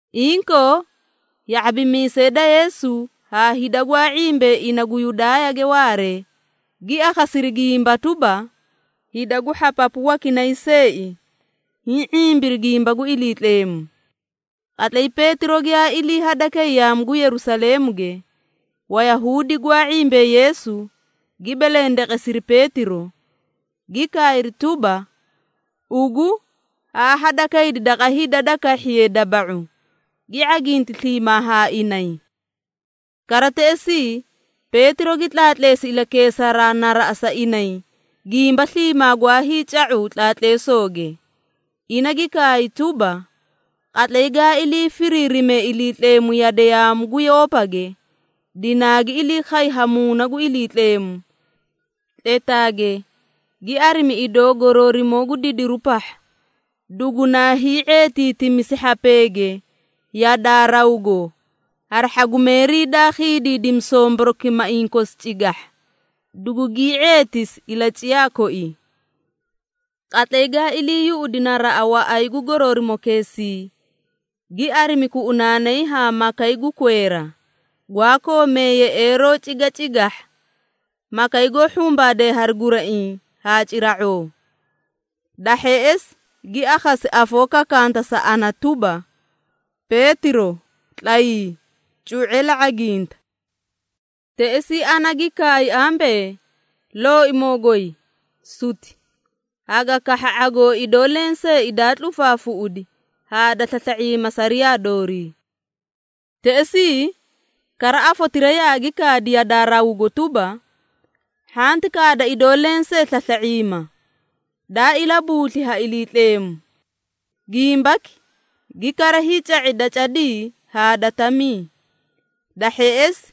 Inkoo, ya⁄abimiisee da Yeesu haa hida gwaa ⁄imbee ina gu Yudaayage waaree, gi akhasiri gimba tuba, hida gu hhapapu wakinay seei hiĩ ⁄imbiri gimba gu Iliitleemu. Qatlay Peetiro giyaa ilii hadakay yaamu gu Yerusaleemuge, Wayahuudi gwaa ⁄imbee Yeesu, gi belendeqesiri Peetiro, gi kaayri tuba, “Ugu haa hadakaydi daqa hida da kahhiye daba⁄u, gi ⁄aginti sliimaa haa inay.” Kara teꞌesii, Peetiro gi tlaatleesi ilakeesaraa naraꞌa sa inay gimba sliimaa gwaa hiica⁄u tlaatleesooge. Ina gi kaay tuba, “Qatlay gaa ilii firiirime Iliitleemu yade yaamu gu Yoopage, dinaagi ilii khay ha Muuna gu Iliitleemu, tletaage gi arimi idoo goroorimoo gu didiru pahha, dugunaa hii⁄eetiitimisi hhapeege yadaa rawgo hari hhagumeerii daa khiidiidimi somborokimaiĩ kosi cigahha, dugugii ⁄eetisi ilaciyaa koii. Qatlay gaa ilii yuꞌudi naraꞌa waꞌay gu goroorimokeesii, gi arimi kuꞌunaanay haa makay gu kweera, gwaa koomee yeꞌeeroo cigacigahha, makay goó hhumbaadee hari guraiĩ haa cira⁄oo. Da hheꞌesi, gi akhasi afoo kakanta sa ana tuba, ‘Peetiro tlayii, cu⁄e la ⁄aginta!’ Teꞌesii ana gi kaay ambee, ‘Looimoo goy, suti! Haga kahha ⁄agoo idoo lenseei daa tlufaafuꞌudi haa da slasla⁄iima sariyaa doori.’ Teꞌesii kara afotira yaagi kaadi yadaa rawgo tuba, ‘Hhanti kaada idoo lensee slasla⁄iima, daa ilabuusli ha Iliitleemu.’ Gimbaki gi kara hiica⁄i da cadii haa da tamii. Da hheꞌesi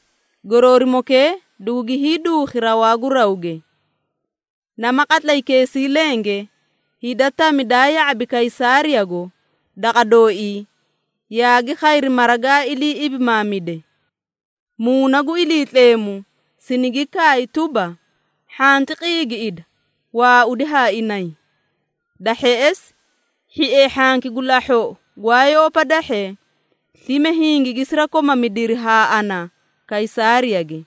goroorimokee dugugi hiiduukhi rawaa gu rawge. Nama qatlaykeesii lenge, hida tami daa ya⁄abi Kaysaariyago daqa dooii, yaagi khayri mara gaa ilii ibimaamide. Muuna gu Iliitleemu sinigi kaay tuba, hhanti qiigiꞌida waaudi haa inay. Da hheꞌesi, hhiee hhanki gu lahhoꞌo gwaa Yoopa dahhee, slime hingigi sirakomamidiri haa ana Kaysaariyage,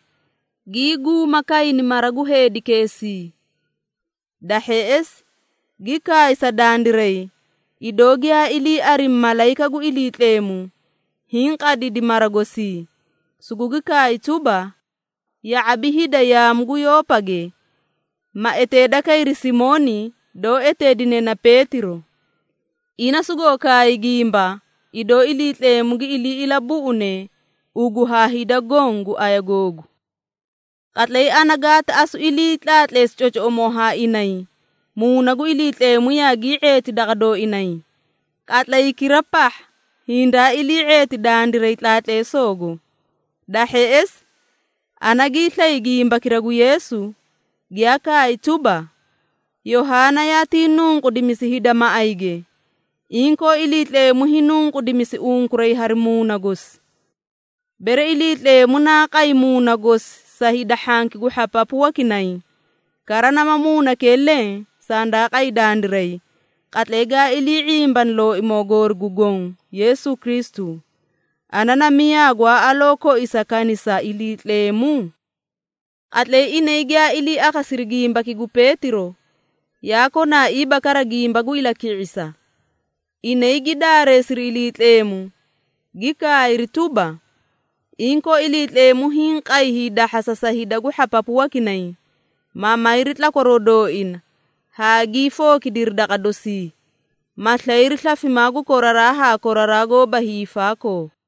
gii guuma kayni mara gu heedikeesii. Da hheꞌesi, gi kaay sa dandiray, idoo giyaa ilii arimi malayika gu Iliitleemu hiĩ qadidi mara gosii, sugugi kaay tuba, ‘Ya⁄abi hida yaamu gu Yoopage, ma eteeda kayri Simooni doó eteedine na Peetiro. Ina sugoo kaay gimba, idoo Iliitleemu gi ilii ilabuꞌune ugu haa hida goõ gu aya googu!’ Qatlay ana gaati asu ilii tlaatleesi cocoꞌomoo haa inay, Muuna gu Iliitleemu yaagii ⁄eeti daqa dooinay, qatlaykira pahha hindaa ilii⁄eeti dandiray tlaatleesoogo. Da hheꞌesi, ana gii slay gimbakira gu Yeesu, giyaa kaay tuba, ‘Yohaana yaatii nunqudimisi hida maꞌayge, inkoo, Iliitleemu hiinunqudimisi unkuray hari Muuna gosi.’ Bere Iliitleemu naa qay Muuna gosi sa hida hhanki gu hhapapu wakinay, kara nama Muunakee leẽ sandaa qay dandiray, qatlay gaa ilii ⁄imbani Looimoo goori gu Goõ Yeesu Kristu, ana na miyaa gwaa aloo koisa kanisa Iliitleemu?” Qatlay inay giyaa ilii akhasiri gimbaki gu Peetiro, yaa konaaiiba kara gimba gu ilaki⁄isa. Inay gi daareesiri Iliitleemu, gi kaayri tuba, “Inkoo Iliitleemu hiĩ qay hiidahhasa sa hida gu hhapapu wakinay, ma mayri tlakwaroo dooina haa gii fookidiri daqa dosii, ma slayri slafimaa gu koraraa haa koraraa goóba hiifaakoo.”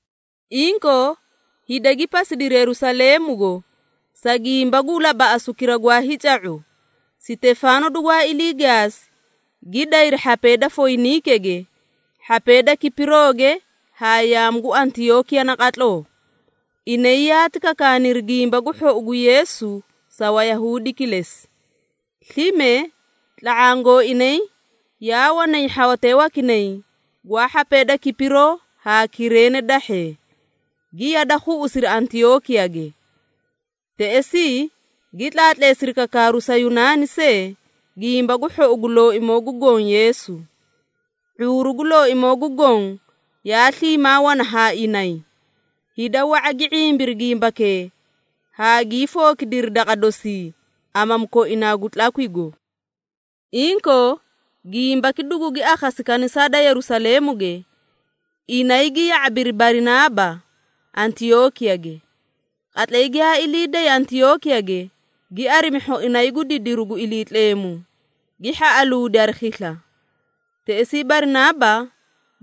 Inkoo, hida gi pasidiri Yerusaleemugo, sa gimba gu labaꞌasukira gwaa hiica⁄u, Sitefaano dugwaa ilii gaasi, gi dayri hhapee da Foyiniikege, hhapee da Kipirooge haa yaamu gu Antiyookiya naqatloo. Inay yaati kakaaniri Gimba gu Hhou gu Yeesu sa Wayahuudi kilesi. Slime tla⁄aã gooinay yaa wanay hhawatee wakinay gwaa hhapee da Kipiroo haa Kireene dahhee, gi yada khuꞌusiri Antiyookiyage. Teꞌesii gi tlaatleesiri kakaaru sa Yunaani see Gimba gu Hhou gu Looimoo gu Goõ Yeesu. ⁄uuru gu Looimoo gu Goõ yaa sliimaa wana haa inay, hida wa⁄a gi ⁄imbiri gimbakee haa gii fookidiri daqa dosii amamu koinaa gu tlakwigo. Inkoo, gimbaki dugugi akhasi kanisaa da Yerusaleemuge, inay gi ya⁄abiri Barinaaba, Antiyookiyage. Qatlay giyaa ilii day Antiyookiyage, gi arimi hhoinay gu didiru gu Iliitleemu, gi hhaꞌaluudi hari khisla. Teꞌesii Barinaaba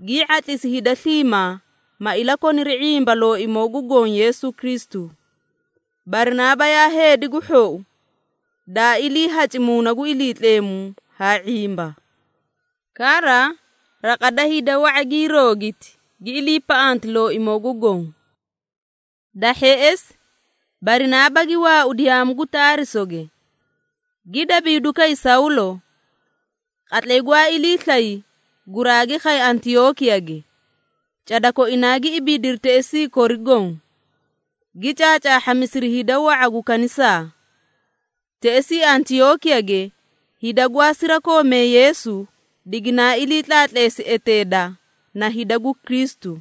gii ⁄atlisi hida sliimaa, ma ilakoniri ⁄imba Looimoo gu Goõ Yeesu Kristu. Barinaaba yaa heedi gu hhou, daa iliihaci Muuna gu Iliitleemu haa ⁄imba. Kara raqa da hida wa⁄a gii roogiti, gi iliipaꞌanti Looimoo gu Goõ. Da hheꞌesi, Barinaaba gi waaudi yaamu gu Taarisoge, gi dabiiduu kay Sawlo. Qatlay gwaa ilii slay, guraagi khay Antiyookiyage. Cada koinaa gi ibiidiri teꞌesii kori goõ, gi caacaahhamisiri hida wa⁄a gu kanisaa. Teꞌesii Antiyookiyage hida gwaa sirakoomee Yeesu diginaa ilii tlaatleesi eteeda na “Hida gu Kristu.”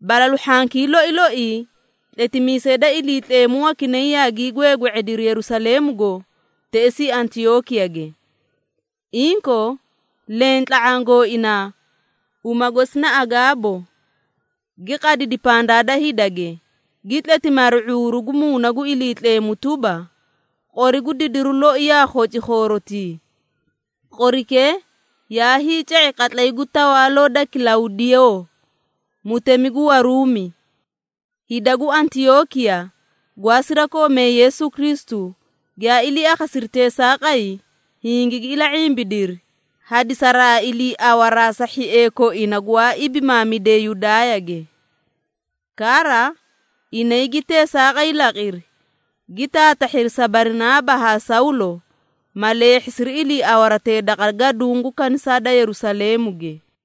Balalu hhankii loi loii tletimiisee da Iliitleemu wakinay yaagii gweegwe⁄ediri Yerusaleemugo teꞌesii Antiyookiyage. Inkoo leẽ tla⁄aã gooinaa, uma gosi na Agaabo, gi qadidi pandaa da hidage, gi tletimi hari ⁄uuru gu Muuna gu Iliitleemu tuba, “Qori gu didiru loi yaa khoci khoorotii.” (Qorikee yaa hiica⁄i qatlay gu tawaaloo da Kilawdiyoo, mutemi gu Waruumi.) Hida gu Antiyookiya gwaa sirakoomee Yeesu Kristu, giyaa ilii akhasiri teesaaqay, hingigi ila⁄imbidiri, hadisaraa iliiawaraa sa hhiee koina gwaa ibimaamidee Yudaayage. Kara inay gi teesaaqay laqiri, gi taatahhiri sa Barinaaba haa Sawlo, ma leehhisiri iliiawaratee daqa gaduũ gu kanisaa da Yerusaleemuge.